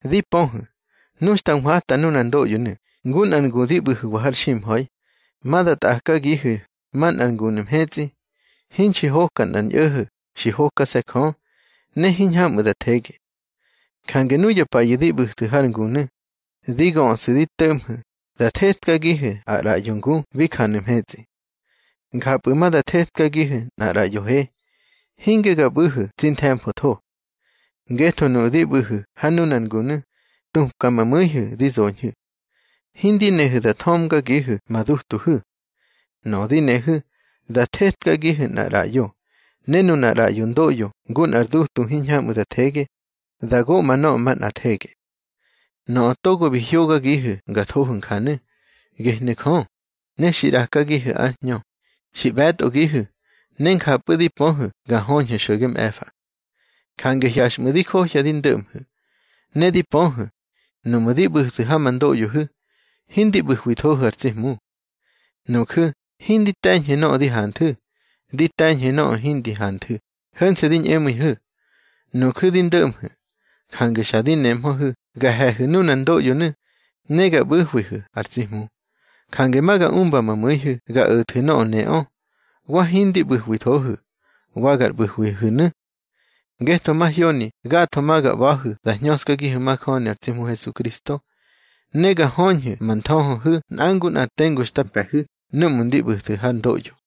Di pöhu̱, nu xta nhwata nunar ndoꞌyonu̱ ngu nꞌar ngu di ꞌbu̱hu̱wa har ximha̱i, ma da tꞌakagihu̱ manꞌar ngunu̱ mhetsꞌi, hinxi hoka nꞌar ñꞌo̱ho̱, xi hokase̱ Jö, ne hiñhamꞌu̱ da thege. Jange nuya payu̱ di ꞌbu̱thu̱ har ngunu̱, di göꞌsu̱ di to̱ꞌmhu̱ da thetkagihu̱ ar ꞌraꞌyo ngu bi janu̱ mhetsꞌi. Njapꞌu̱ ma da thetkagihu̱ nꞌar ꞌraꞌyo he, hinge ga ꞌbu̱hu̱ tsi nthe̱mfotho. Ngetho nuꞌu̱ di ꞌbu̱hu̱ ha nunar ngunu̱, tupka ma mu̱ihu̱ di zoñhu̱. Hindi nehu̱ da thömgagihu̱ ma dutuhu̱. Nöꞌö di nehu̱, da thetkagihu̱ nꞌar ꞌraꞌyo. Ne nunar ꞌraꞌyo ndoꞌyo ngu nꞌar dutu hiñhamꞌu̱ da thege, da goꞌma nöꞌö manꞌa thege. Nöꞌö togo bi hyógagihu̱ nga thohu̱ njanu̱, gehnu̱ Jö. Ne xi ꞌrakagihu̱ ár Hñö, xi ꞌbe̱tꞌogihu̱, ne njapꞌu̱ di pöhu̱ ga höñhu̱ xo̱ge mꞌe̱fa. Jange hyaxꞌmu̱ di johya di ndo̱ꞌmhu̱. Ne di pöhu̱, nuꞌmu̱ di ꞌbu̱thu̱ ha ma ndoꞌyohu̱, hindi ꞌbu̱hwithohu̱ ar tsi Hmu. Nuju̱ hindi te̱ñhu̱ nöꞌö di hanthu̱, di te̱ñhu̱ nöꞌö hindi hanthu̱, ho̱nse̱ di ñꞌemu̱ihu̱. Nuju̱ di ndo̱ꞌmhu̱, jange xa di nemhöhu̱ ga he̱hu̱ nunar ndoꞌyonu̱, ne ga ꞌbu̱hwihu̱ ar tsi Hmu. Jange ma ga umba ma mu̱ihu̱ ga o̱thu̱ nöꞌö neꞌö, wa hindi ꞌbu̱hwithohu̱, wa gar ꞌbu̱hwihu̱nu̱. Ngetho mahyoni gatho ma ga ꞌba̱hu̱ da hñöskagihu̱ majöni ar tsi Hmu Hesukristo. Ne ga höñhu̱ ma nthöhöhu̱ nꞌa ngu nꞌa tengu xta mpe̱hu̱ núꞌmu̱ ndi ꞌbu̱thu̱ har ndoꞌyo.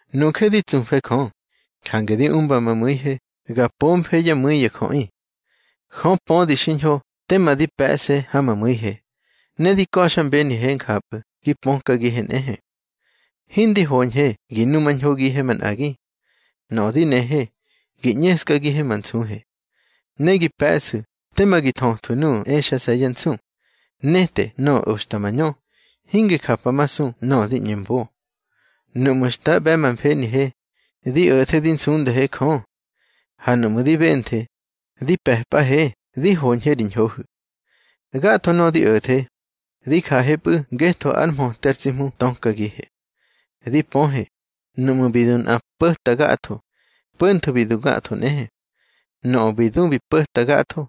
Nuje di tsufe Jö, jange di umba ma mu̱ihe ga pomfe yá mu̱i ya jöꞌi. Jö pödi xiñho tema di pe̱ꞌse ha ma mu̱ihe, ne di ka̱xmbenihe njapꞌu̱ gi pökagihe nꞌehe. Hindi hoñhe gi numañhogihe manꞌagi. Nöꞌö di nehe, gi ꞌñeskagihe ma nsuhe. Ne gi pe̱ꞌsu̱ tema gi thöthwu̱ nuꞌu̱ exase̱ yá nsu, nete nöꞌö oxta mañö, hingi japamasu nöꞌö di ꞌñe mbo. Nuꞌmu̱ xta ꞌbe̱ ma mfenihe, di o̱the di nsundahe Jö. Ha nuꞌmu̱ di benthe, di pe̱pꞌahe di hoñhe ri ñhohu̱. Gatho nöꞌö di o̱the, di jahepꞌu̱ ngetho ár mhöte ar tsi Hmu tökagihe. Di pöhe, nuꞌmu̱ bi du nꞌa po̱ta gatho, po̱ntho bi du gatho nꞌehe. Nöꞌö bi du bi po̱ta gatho,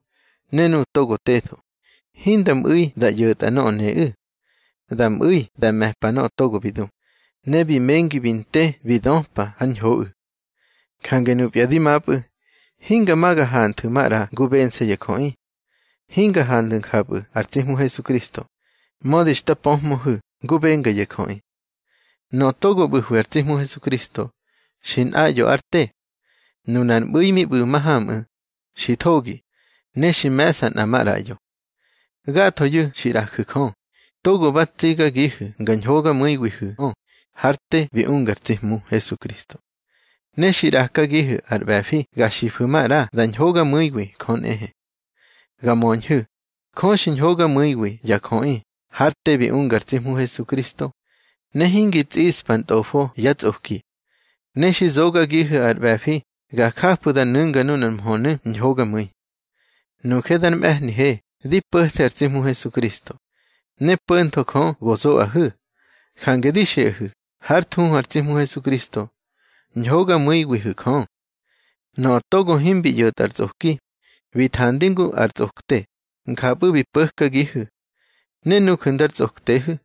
ne nuꞌu̱ togo tetho, hinda mꞌu̱i da ꞌyo̱tꞌa nöꞌö neꞌu̱. Da mꞌu̱i da me̱pa nöꞌö togo bi du, ne bi mengi bi nte bi döpa ár ñhoꞌu̱. Jange nupya dimapꞌu̱, hinga ma ga hanthu̱ maꞌra ngu bense̱ ya jöꞌi. Hinga hanthu̱ njapꞌu̱ ar tsi Hmu Hesukristo, mödi xta pöhmöhu̱ ngu benga ya jöꞌi. Nöꞌö togo ꞌbu̱hwi ar tsi Hmu Hesukristo, xi nꞌaꞌyo ár te. Nunar mꞌu̱i mi ꞌbu̱ mahamꞌu̱, xi thogi, ne xi me̱ꞌsa nꞌa maꞌraꞌyo. Gathoyu̱ xi ꞌraju̱ Jö, togo ba tsigagihu̱ nga ñhogamu̱iwihu̱ꞌö hár te bi unga ar tsi Hmu Hesukristo. Ne xi ꞌrakagihu̱ ar ꞌbe̱fi ga xifu̱ maꞌra da ñhogamu̱iwi Jö nꞌehe. Ga möñhu̱, Jö xi ñhogamu̱iwi ya jöꞌi hár te bi unga ar tsi Hmu Hesukristo, ne hingi tsꞌiꞌspa ntꞌofo yá tsꞌoki. Ne xi zogagihu̱ ar ꞌbe̱fi ga jafu̱ da nu̱nga nunar mhönu̱ ñhogamu̱i. Nuje dar mꞌe̱hnihe di po̱the ar tsi Hmu Hesukristo, ne po̱ntho Jö go zoꞌahu̱. Jange di xiꞌahu̱ hár thuhu ar tsi Hmu Hesukristo: Ñhogamu̱iwihu̱ Jö. Nöꞌö togo himbi ꞌyo̱tꞌa ar tsꞌoki, bi thandi ngu ar tsꞌokte, njapꞌu̱ bi po̱kagihu̱. Ne nuju̱ ndar tsꞌoktehu̱,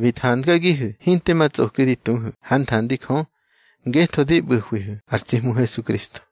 bi thangagihu̱ hinte ma tsꞌoki di tuhu̱ hár nthandi Jö, ngetho di ꞌbu̱hwihu̱ ar tsi Hmu Hesukristo.